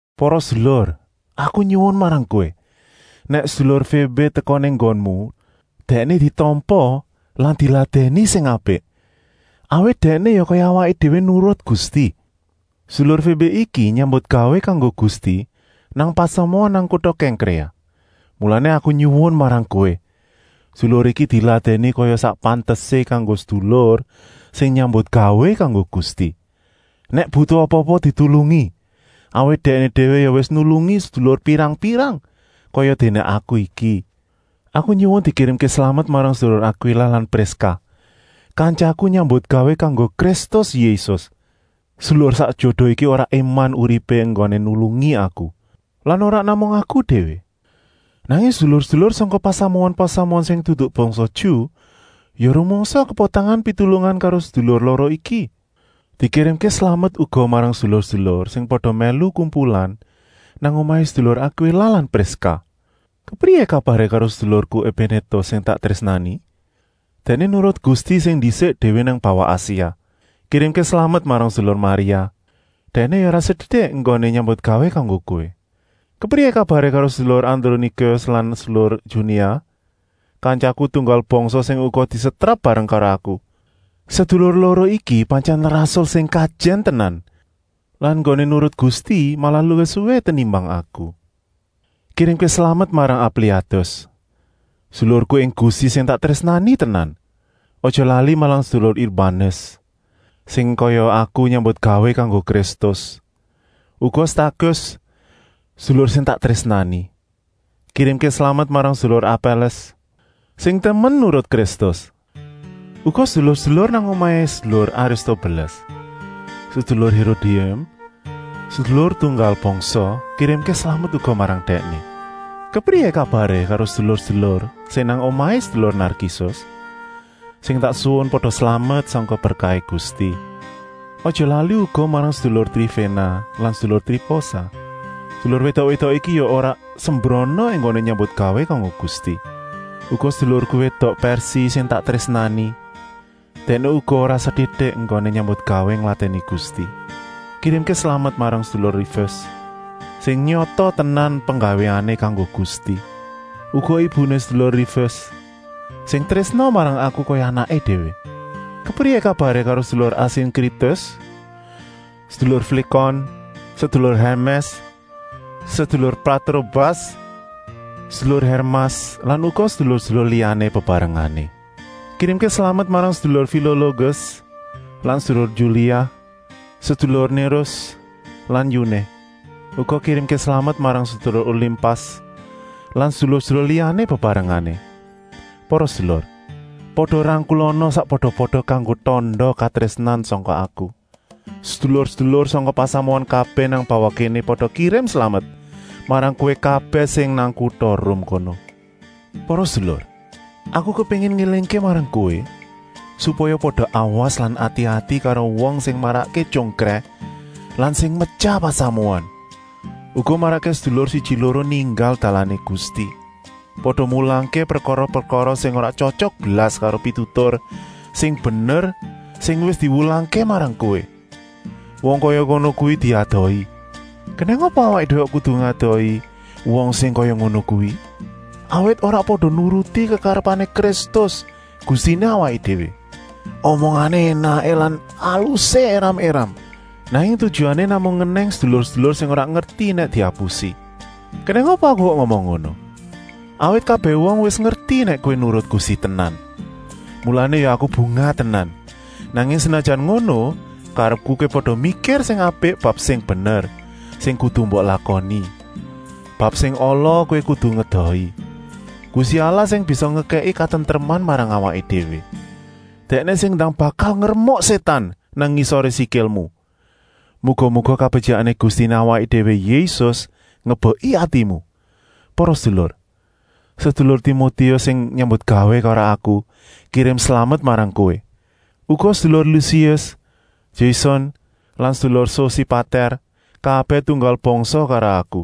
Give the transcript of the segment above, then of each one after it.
Para sedulur, aku nyuwun marang kowé, nèk sedulur Fébé teka nang nggonmu, dèkné ditampa lan diladèni sing apik, awit dèkné ya kaya awaké déwé nurut Gusti. Sedulur Fébé iki nyambutgawé kanggo Gusti nang pasamuan nang kuta Kèngkréa. Mulané aku nyuwun marang kowé, sedulur iki diladèni kaya sak pantesé kanggo sedulur sing nyambutgawé kanggo Gusti. Nèk butuh apa-apa ditulungi, awit dèkné déwé ya wis nulungi sedulur pirang-pirang, kayadéné aku iki. Aku nyuwun dikirimké slamet marang sedulur Akwila lan Priska, kantyaku nyambutgawé kanggo Kristus Yésus. Sedulur sak jodo iki ora éman uripé enggoné nulungi aku. Lan ora namung aku déwé, nanging sedulur-sedulur sangka pasamuan-pasamuan sing dudu bangsa Ju ya rumangsa kepotangan pitulungan karo sedulur loro iki. Dikirimké slamet uga marang sedulur-sedulur sing pada mèlu kumpulan nang omahé sedulur Akwila lan Priska. Kepriyé kabaré karo sedulurku Epénétus sing tak trésnani? Dèkné nurut Gusti sing ndisik déwé nang bawah Asia. Kirimké slamet marang sedulur Maria. Dèkné ya ora setitik enggoné nyambutgawé kanggo kowé. Kepriyé kabaré karo sedulur Adronikus lan sedulur Junia, kantyaku tunggal bangsa sing uga disetrap bareng karo aku. Sedulur loro iki pantyèn rasul sing kajèn tenan lan enggoné nurut Gusti malah luwih suwi tenimbang aku. Kirimké slamet marang Ampliatus, sedulurku ing Gusti sing tak trésnani tenan. Aja lali marang sedulur Urbanus, sing kaya aku nyambutgawé kanggo Kristus. Uga Stakis, sedulur sing tak trésnani. Kirimké slamet marang sedulur Apèles, sing temen nurut Kristus. Uga sedulur-sedulur nang omahé sedulur Aristobeles. Sedulur Hérodium, sedulur tunggal bangsa, kirimké slamet uga marang dèkné. Kepriyé kabaré karo sedulur-sedulur sing nang omahé sedulur Narkisus? Sing tak suwun pada slamet sangka berkahé Gusti. Aja lali uga marang sedulur Triféna lan sedulur Triposa. Sedulur wédok-wédok iki ya ora sembrana enggoné nyambutgawé kanggo Gusti. Uga sedulurku wédok Pèrsi sing tak trésnani. Dèkné uga ora setitik enggoné nyambutgawé ngladèni Gusti. Kirimké slamet marang sedulur Rufus, sing nyata tenan penggawéané kanggo Gusti. Uga ibuné sedulur Rufus, sing trésna marang aku kaya anaké déwé. Kepriyé kabaré karo sedulur Asinkritus, sedulur Flikon, sedulur Hèrmès, sedulur Patrobas, sedulur Hèrmas lan uga sedulur-sedulur liyané bebarengané? Kirimké slamet marang sedulur Filologes lan sedulur Yulia, sedulur Nérus lan yuné. Uga kirimké slamet marang sedulur Olimpas lan sedulur-sedulur liyané bebarengané. Para sedulur, pada rangkulana sakpada-pada kanggo tanda katrésnan sangka aku. Sedulur-sedulur sangka pasamuan kabèh nang bawah kéné pada kirim slamet marang kowé kabèh sing nang kuta Rum kono. Para sedulur, aku kepéngin ngélingké marang kowé, supaya pada awas lan ati-ati karo wong sing marakké tyongkrèh lan metyah pasamuan, uga marakké sedulur siji-loro ninggal dalané Gusti. Pada mulangké prekara-prekara sing ora tyotyok blas karo pitutur sing bener sing wis diwulangké marang kowé. Wong kaya ngono kuwi diedohi. Kenèng apa awaké déwé kok kudu ngedohi wong sing kaya ngono kuwi? Awit ora pada nuruti kekarepané Kristus, Gustiné awaké déwé. Omongané énaké lan alusé éram-éram, nanging tujuané namung ngenèng sedulur-sedulur sing ora ngerti nèk diapusi. Kenèng apa aku kok ngomong ngono! Awit kabèh wong wis ngerti nèk kowé nurut Gusti tenan. Mulané aku ya bungah tenan. Nanging senajan ngono, karepku kowé pada mikir sing apik bab sing bener, sing kudu mbok lakoni. Bab sing ala, kuwi kudu diedohi. Gusti Allah sing bisa ngekèki katentreman marang awaké déwé, Dèkné sing ndang bakal ngremuk Sétan nang ngisoré sikilmu. Muga-muga kabetyikané Gustiné awaké déwé Yésus ngebeki atimu! Para sedulur, sedulur Timotius sing nyambutgawé karo aku, kirim slamet marang kowé. Uga sedulur Lusius, Jason lan sedulur Sosipatèr, kabèh tunggal bangsa karo aku.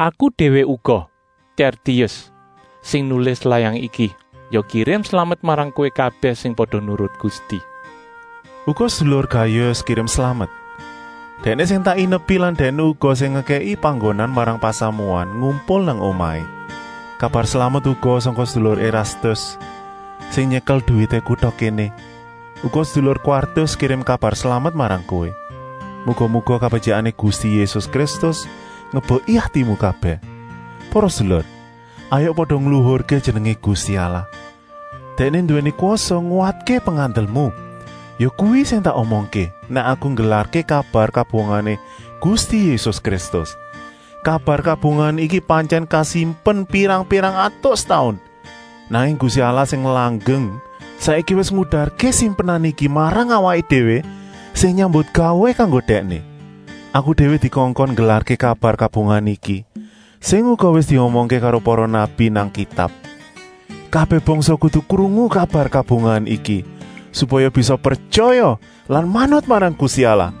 Aku déwé uga, Tèrtius, sing nulis layang iki, ya kirim slamet marang kowé kabèh sing pada nurut Gusti. Uga sedulur Gayus kirim slamet. Dèkné sing tak inepi lan dèkné uga sing ngekèki panggonan marang pasamuan ngumpul nang omahé. Kabar slamet uga sangka sedulur Erastus, sing nyekel duwité kuta kéné. Uga sedulur Kwartus kirim kabar slamet marang kowé. Muga-muga kabetyikané Gusti Yésus Kristus ngebeki atimu kabèh. Para sedulur, hayuk pada ngluhurké jenengé Gusti Allah. Dèkné nduwèni kwasa nguwatké pengandelmu. Yakuwi sing tak omongké, nèk aku nggelarké kabar kabungahané Gusti Yésus Kristus. Kabar kabungahan iki pantyèn kasimpen pirang-pirang atus taun. Nanging Gusti Allah sing langgeng saiki wis ngudarké simpenan iki marang awaké déwé sing nyambutgawé kanggo Dèkné. Awaké déwé dikongkon nggelarké kabar kabungahan iki, sing uga wis diomongké karo para nabi nang Kitab. Kabèh bangsa kudu krungu kabar kabungahan iki, supaya bisa pretyaya lan manut marang Gusti Allah.